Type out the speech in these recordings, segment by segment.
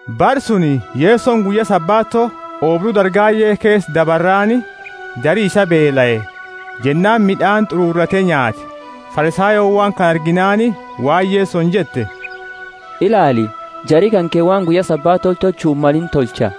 Bara suni, Yesoni guyya Sabato oobru dargaye keesa dabarraani, jari isaa beelae, jennaani mid'aani t'ururate nyaate. Farisayooni waan kana arginaani waan Yesoni jette, Ilaali, jari kanke waan guyya Sabato tolchu himmalini tolcha.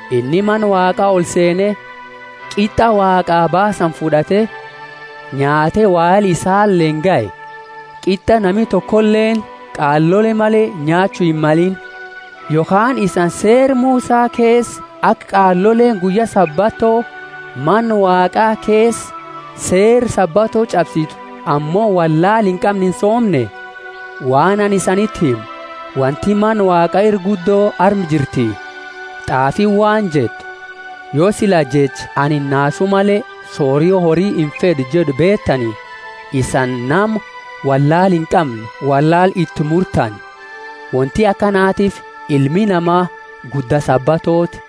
Inni Mana Waaqa olseene, qit'a Waaqaa baasani fud'ate, nyaate wahela isaleeni gahe — qit'a nami tokoleeni, qaalole male, nyaachu himmalini. Yokhaani isani Seera Musa keesa aka qaaloleeni guyya Sabato Mana Waaqa keesa seera Sabato ch'absitu ammo wollaala inqamne insoomne? Waan anini isaniti himu, Wonti Mana Waaqa ira guddo arma jirti. T'aafiini waan jettu, yo sila jecha, anini nasu male sorio hori infed'u jed'u beetani, isani nama wollaala inqamne wollaala itimurtani. Wonti akanatiifi Ilmi Nama gudda Sabatooti.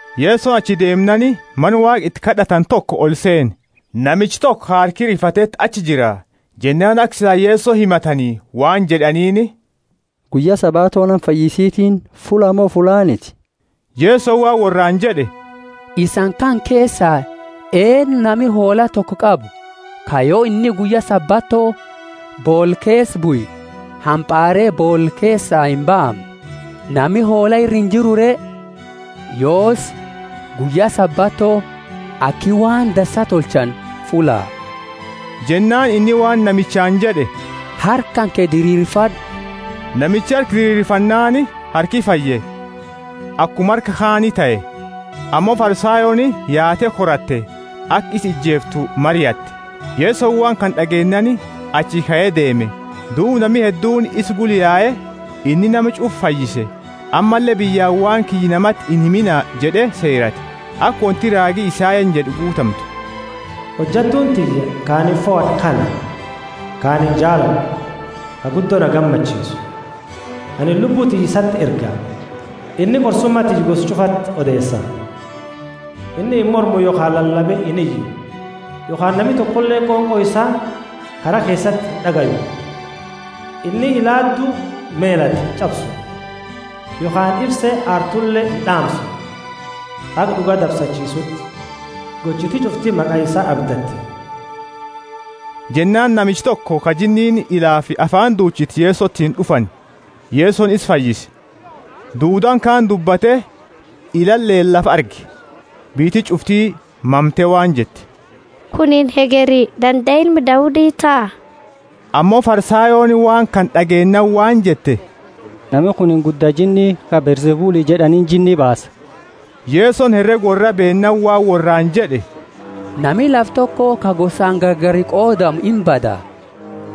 Yesoni achi deemnaani Mana Waaqa iti kad'atani toko olseene. Namicha toko ka harki rifateti achi jira. Jennaani aka sila Yeso himatani waan jed'aniini, Guyya Sabato nama fayyisitiini fullaa mo fullaaniti? Yesoni waan worraani jed'e, Isani kana keesa, eennu nami hoola toko qabu, ka yo inni guyya Sabato boola keesa bue, hampaare boola keesaa imbaamne? Nami hoola ira injiru re? Yoosi, guyya Sabato aki waan dansaa tolchani fulla. Jennaani inni waan namichaani jed'e, Harka kanke diriirfad'u. Namichi harka diriirfannaani harki fayye, akuma harka kaani tahe. Ammo Farisayooni yaate koratte, aka isa ijeeftu mariatte. Yesoni waan kana d'ageennaani achi kae deeme, duuba nami hedduuni isa gula yae. Inni nama ch'ufa fayyise, ammalle biyyaani waan kiyya namati inhimina jed'e seerate, aka wonti raagi Isayani jed'e guutamtu: Hojattuuni tiyya ka anini fohad'e kana, ka ani jaalad'u, ka guddo na gammachiisu. Anini Lubbu tiyya isati erga, inni qorsuma tiyya gosa ch'ufati odeesa. Inni imormu yokhaani lalabe iniyu, yokhaani nami tokoleeni qonqo isaa kara keesati ind'agayu. Inni ilaadu melatte inch'absu, yokhaani ifse aartule ind'aamsu, haga d'uga dabsachiisuuti. Gochiti ch'ufti maqa isaa abdatti. Jennaani namicha toko ka jinniini ilaafi afaani duchite Yesotiini d'ufani, Yesoni isa fayyise, duudaani kaani dubbate ilaaleeni lafa arge. Biyyiti ch'ufti mamte waan jette, Kunini hegeri dandae Ilma Daudi taha? Ammo Farisayooni waan kana d'ageennaani waan jette, Nami kunini gudda jinni, ka Beelzebuli jed'aniini, jinni baasa. Yesoni herega worraa beennaani waan worraani jed'e, Nami lafa toko ka gosaani gargari qodamu imbada.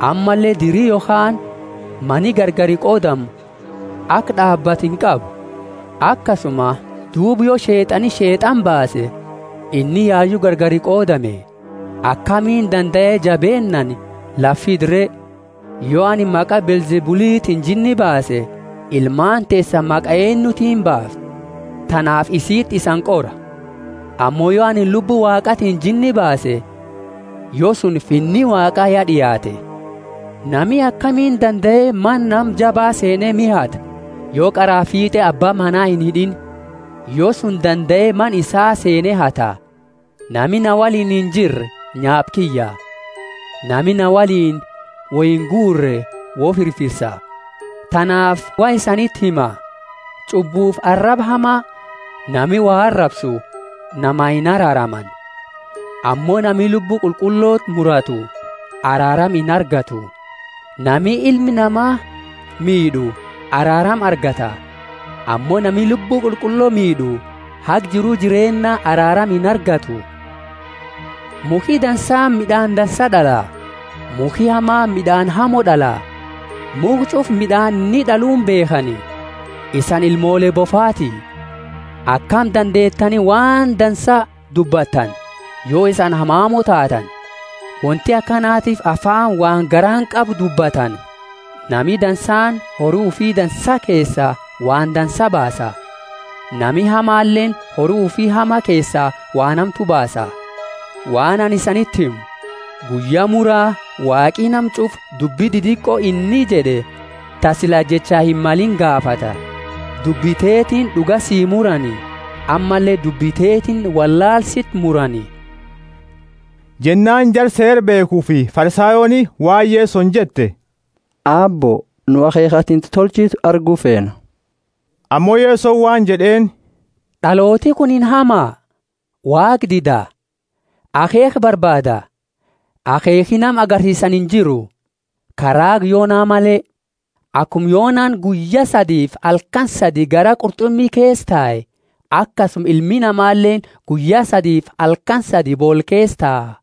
Ammalle diri yokhaani mani gargari qodamu aka d'aabatu inqabu. Akasuma duuba yo Sheet'ani Sheet'ana baase, inni yayu gargari qodame; akamiini dandae jabeennaani lafa fida re? Yo anini maqa Beelzebulitiini jinni baase, ilmaani teesani maqa eennutiini baafti? Tanaafi isiti isani qora. Ammo yo anini Lubbu Waaqatiini jinni baase, yo suni Finni Waaqa ya d'iaate. Nami akami dandae mana nama jaba seene miha hata, yo qaraa fiit'e abba mana inhid'iini? Yo suni dandae mana isaa seene hata. Nami na woliini injirre nyaapa kiyya; nami na woliini woingurre wofirfisa. Tanaafi waan anini isaniti himu: Ch'ubbufi araba hama nami wo arabsu, namaa inaraaramani, ammo nami Lubbu Qulqulloti muratu araarama inargattu. Nami Ilma Nama miid'u araarama argata; ammo nami Lubbu Qulqullo miid'u haga jiru jireenna araarama inargattu. Mukhi dansaani mid'aani dansaa d'ala, mukhi hamaani mid'aani hamo d'ala. Mukha ch'ufa mid'aani inni d'aluuni beekhani. Isani ilmoole bofaati! Akami dandeetani waan dansa dubbattani, yo isani hamamo taatani? Wonti akanatiifi afaani waan garaani qabu dubbatani. Nami dansaani hori ufi dansa keesaa waan dansaa baasa; nami hamaleeni hori ufi hama keesaa waan hamtu baasa. Waan anini isanti himu, guyya mura Waaqi nama ch'ufa dubbi didiqo inni jed'e, ta sila jecha himmalini gaafata. Dubbi teetiini d'uga sii murani, ammalle dubbi teetiini wollaala siti murani. Jennaani jara Seera beekhufi Farisayooni waan Yesoni jette, Aabbo, nu akheekha atini tolchitu argu feena. Ammo Yesoni waan jed'eeni, D'alooti kunini hama, Waaqa dida, akheekha barbaada, akheekhi nama agarsiisani injiru, ka raaga Yona male. Akuma Yonani guyya sadifi halkani sadi garaa qurt'umi keesa tae, akasuma Ilmi Namaleeni guyya sadifi halkani sadi boola keesa taa.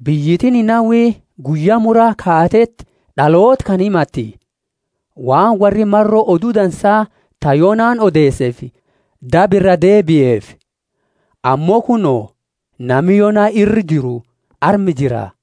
Biyyiti Ninawi Guyya Mura kaateti d'aloota kana himatti, waan worri maro odu dansa ta Yonani odeeseefi daba iraa deebiefi. Ammo kuno, nami Yona ira jiru arma jira.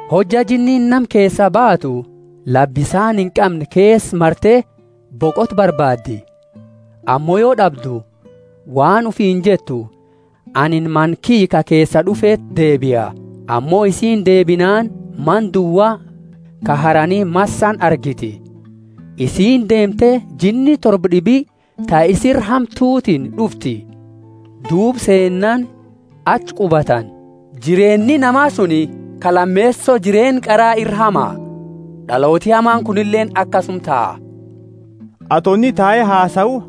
Hojja jinniini nama keesaa baatu, lafa bisaani inqamne keesa marte boqota barbaaddi; ammo yo d'abdu waan ufiini jettu, Anini mana kiyya ka keesaa d'ufeti deebia. Ammo isiini deebinaani mana duwa, ka harani massani argiti. Isiini deemte jinni torba d'ibi ta isi ira hamtutiini d'ufti; duuba seenani achi qubatani. Jireenni nama suni ka lameeso jireenna qara ira hama. D'alooti hamaani kunileeni akasuma taha. Ato inni tae hasau,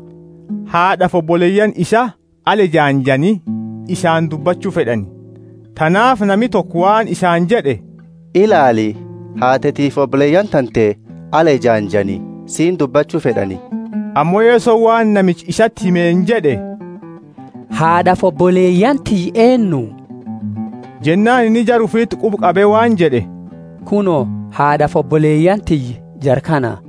haad'afi oboleyaani isaa ala ejaanjani isaani dubbachu fed'ani. Tanaafi nami toko waan isaani jed'e, Ilaali, haatetifi oboleyaani tante ala ejaanjani siini dubbachu fed'ani. Ammo Yesoni waan namicha isati himeeni jed'e, Haad'afi oboleyaani tiyya eennu? Jennaani inni jara ufiti quba qabe waan jed'e, Kuno, haad'afi oboleyaani tiyya jara kana.